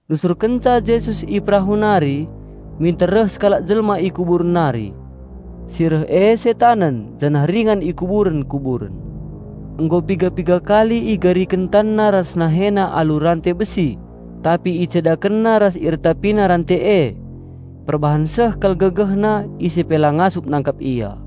Nusurkenca Jesus i perahu nari, minter reh sekalak jelma i kuburen nari. Si reh e setanen janah ringan i kuburen-kuburen. Nggo piga-piga kali igariken tanna ras nahena alu rante besi, tapi icedakenna ras iretapina rante e. Perbahan seh kal gegehna, ise pe la ngasup nangkap ia.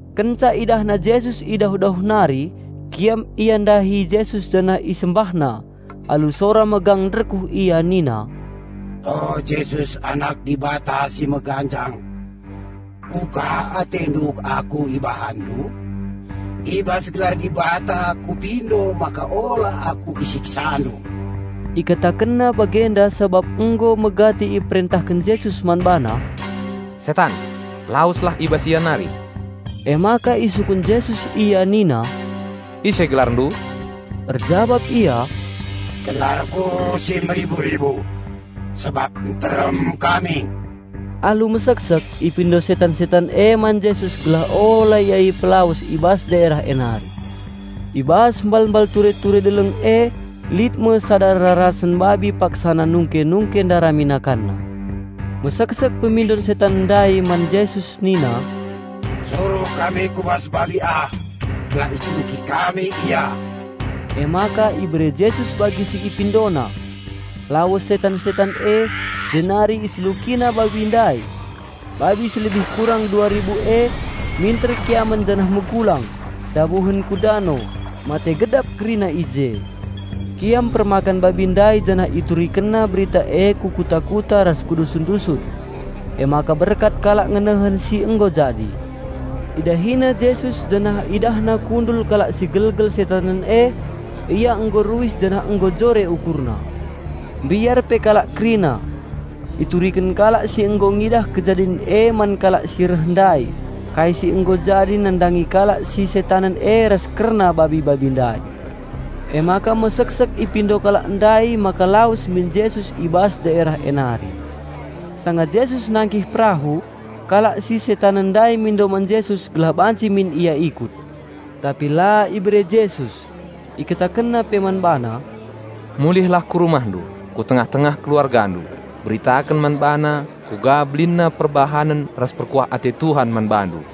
Kenca idahna Jesus i dauh-dauh nari, kiam ia ndahi Jesus janah isembahna. Alu sora megang nderkuh ia nina, "O Jesus Anak Dibata si Meganjang. Kuga AteNdu aku IbahanNdu? I bas gelar Dibata kupindo maka ola aku IsiksaNdu." (Ikatakenna bagenda sabap nggo megati iperentahken Jesus man bana, "Setan, laweslah i bas ia nari.") Emaka isungkun Jesus ia nina, "Ise gelarndu?" Erjabap ia, "Gelarku si Meribu-ribu sabap nterem kami!" Alu meseksek ipindo setan-setan e man Jesus gelah ola ia ipelawes i bas daerah e nari. I bas mbalmbal ture-ture deleng e lit me sada rarasen babi paksana nungke-nungke ndarami nakanna. Meseksek pemindon setan ndai man Jesus nina, "Suruh kami ku bas babi ah gelah iseluki kami ia." Emaka ibere Jesus bagi si ipindona. Lawes setan-setan e, jenari iselukina babi ndai. Babi si lebih kurang dua ribu e, minter kiamen janah megulang, ndabuhen ku dano, mate gedap kerina i je. Kiam permakan babi ndai janah iturikenna berita e ku kuta-kuta ras ku dusun-dusun. Emaka berkat kalak ngenehen si nggo jadi. Idahina Jesus janah idahna kundul kalak si gelgel setanen e, ia nggo ruis janah nggo jore ukurna. Mbiar pe kalak kerina. Ituriken kalak si nggo ngidah kejadin e man kalak si reh ndai kai si nggo jadi nandangi kalak si setanen e ras kerna babi-babi ndai. Emaka meseksek ipindo kalak ndai maka lawes min Jesus i bas daerah e nari. Sanga Jesus nangkih perahu, kalak si setanen ndai mindo man Jesus gelah banci min ia ikut. Tapi la ibere Jesus. IkatakenNa pe man bana, "Mulihlah ku rumahndu, ku tengah-tengah keluargandu, beritaken man bana kuga belinna perbahanen ras perkuah ate Tuhan man bandu."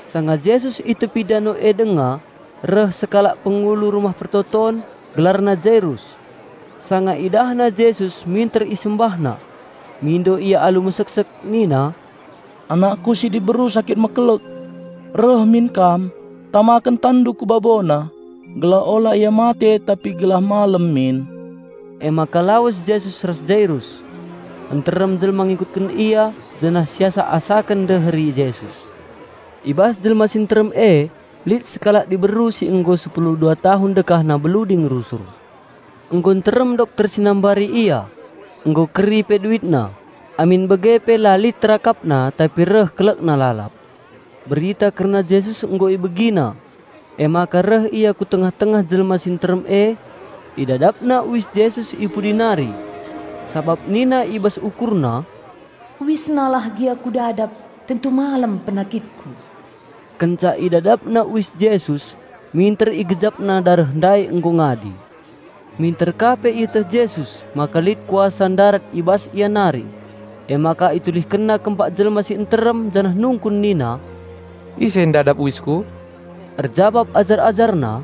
Sanga Jesus i tepi dano e denga reh sekalak pengulu rumah persembahen, gelarna Jairus. Sanga idahna Jesus minter isembahna. Mindo ia alu meseksek nina, "Anakku si diberu sakit mekelek. Reh min Kam, tamaken TanNdu ku babona, gelah ola ia mate tapi gelah malem min." Emaka lawes Jesus ras Jairus. Nterem jelma ngikutken Ia, janah siasak-asaken ndeheri Jesus. I bas jelma si nterem e lit sekalak diberu si nggo sepulu dua tahun dekahna bluding rusur. Nggo nterem dokter si nambari ia, nggo keri pe duitna, tapi la lit terakapna malahen reh kelekna. Berita kerna Jesus nggo ibegina, emaka reh ia ku tengah-tengah jelma si nterem e, idadapna uis Jesus i pudi nari. Sabap nina i bas ukurna, "UisNa lah gia kudadap, tentu malem penakitku." Kenca idadapna uis Jesus minter igejapna dareh ndai nggo ngadi. Minter ka pe ieteh Jesus, maka lit kuasa ndarat i bas Ia nari. Emaka ItulihkenNa kempak jelma si nterem janah nungkun nina, "Ise ndadap uisKu?" Erjabap ajar-AjarNa,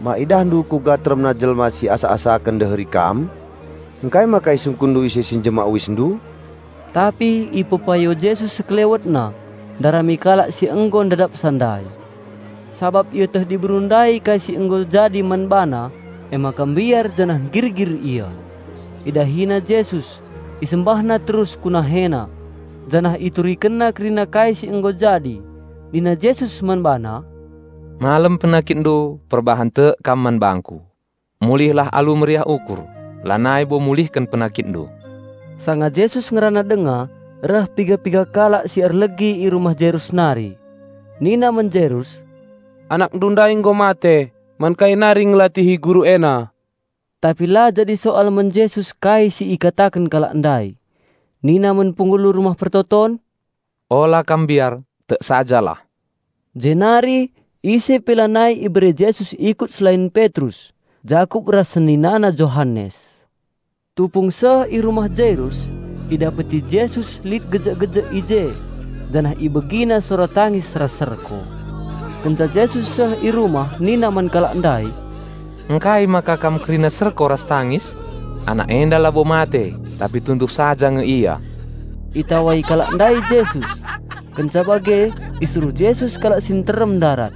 "Ma IdahNdu kuga teremna jelma si asak-asaken ndeheri Kam? Ngkai maka IsungkunNdu ise si njemak UisNdu?" Tapi ipepayo Jesus SekelewetNa ndarami kalak si nggo ndadapsa ndai. Sabap ieteh diberu ndai kai si nggo jadi man bana, emaka mbiar janah nggirgir ia. Idahina Jesus, isembahna terus ku NaheNa, janah iturikenna kerina kai si nggo jadi. Nina Jesus man bana, "Malem penakitndu perbahan tek kam man bangKu. Mulihlah alu meriah ukur, lanai bo mulihken penakitndu." Sanga Jesus ngerana dengan reh piga-piga kalak si erlegi i rumah Jairus nari. Nina man Jairus, "Anakndu ndai nggo mate, man kai nari ngelatihi Guru ena?" Tapi la jadi soal man Jesus kai si ikataken kalak ndai. Nina man pengulu rumah persembahen, "Ola kam mbiar, tek sajalah." Jenari ise pe lanai ibere Jesus ikut selain Petrus, Jakup ras seninana Johanes. Tupung seh i rumah Jarius, idapeti Jesus lit gejek-gejek i je, janah IbegiNa sora tangis ras serko. Kenca Jesus seh i rumah nina man kalak ndai, "Ngkai maka kam kerina serko ras tangis? Anak enda labo mate tapi tunduh saja nge ia!" Itawai kalak ndai Jesus. Kenca bage isuruh Jesus kalak si nterem ndarat.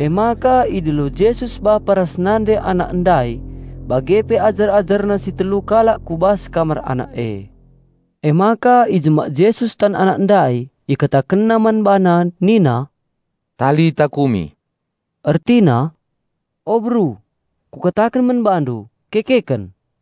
Emaka idilo Jesus bapa ras nande anak ndai bage pe ajar-AjarNa si telu kalak ku bas kamar anak e. Emaka ijemak Jesus tan anak ndai, ikatakenna man bana nina, "Talitakumi," ertina, "O beru, Kukataken man bandu, kekeken!"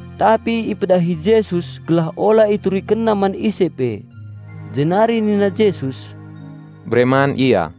Tapi ipedahi Jesus, gelah ola iturikenna man ise pe. Jenari nina Jesus, "Bere man ia."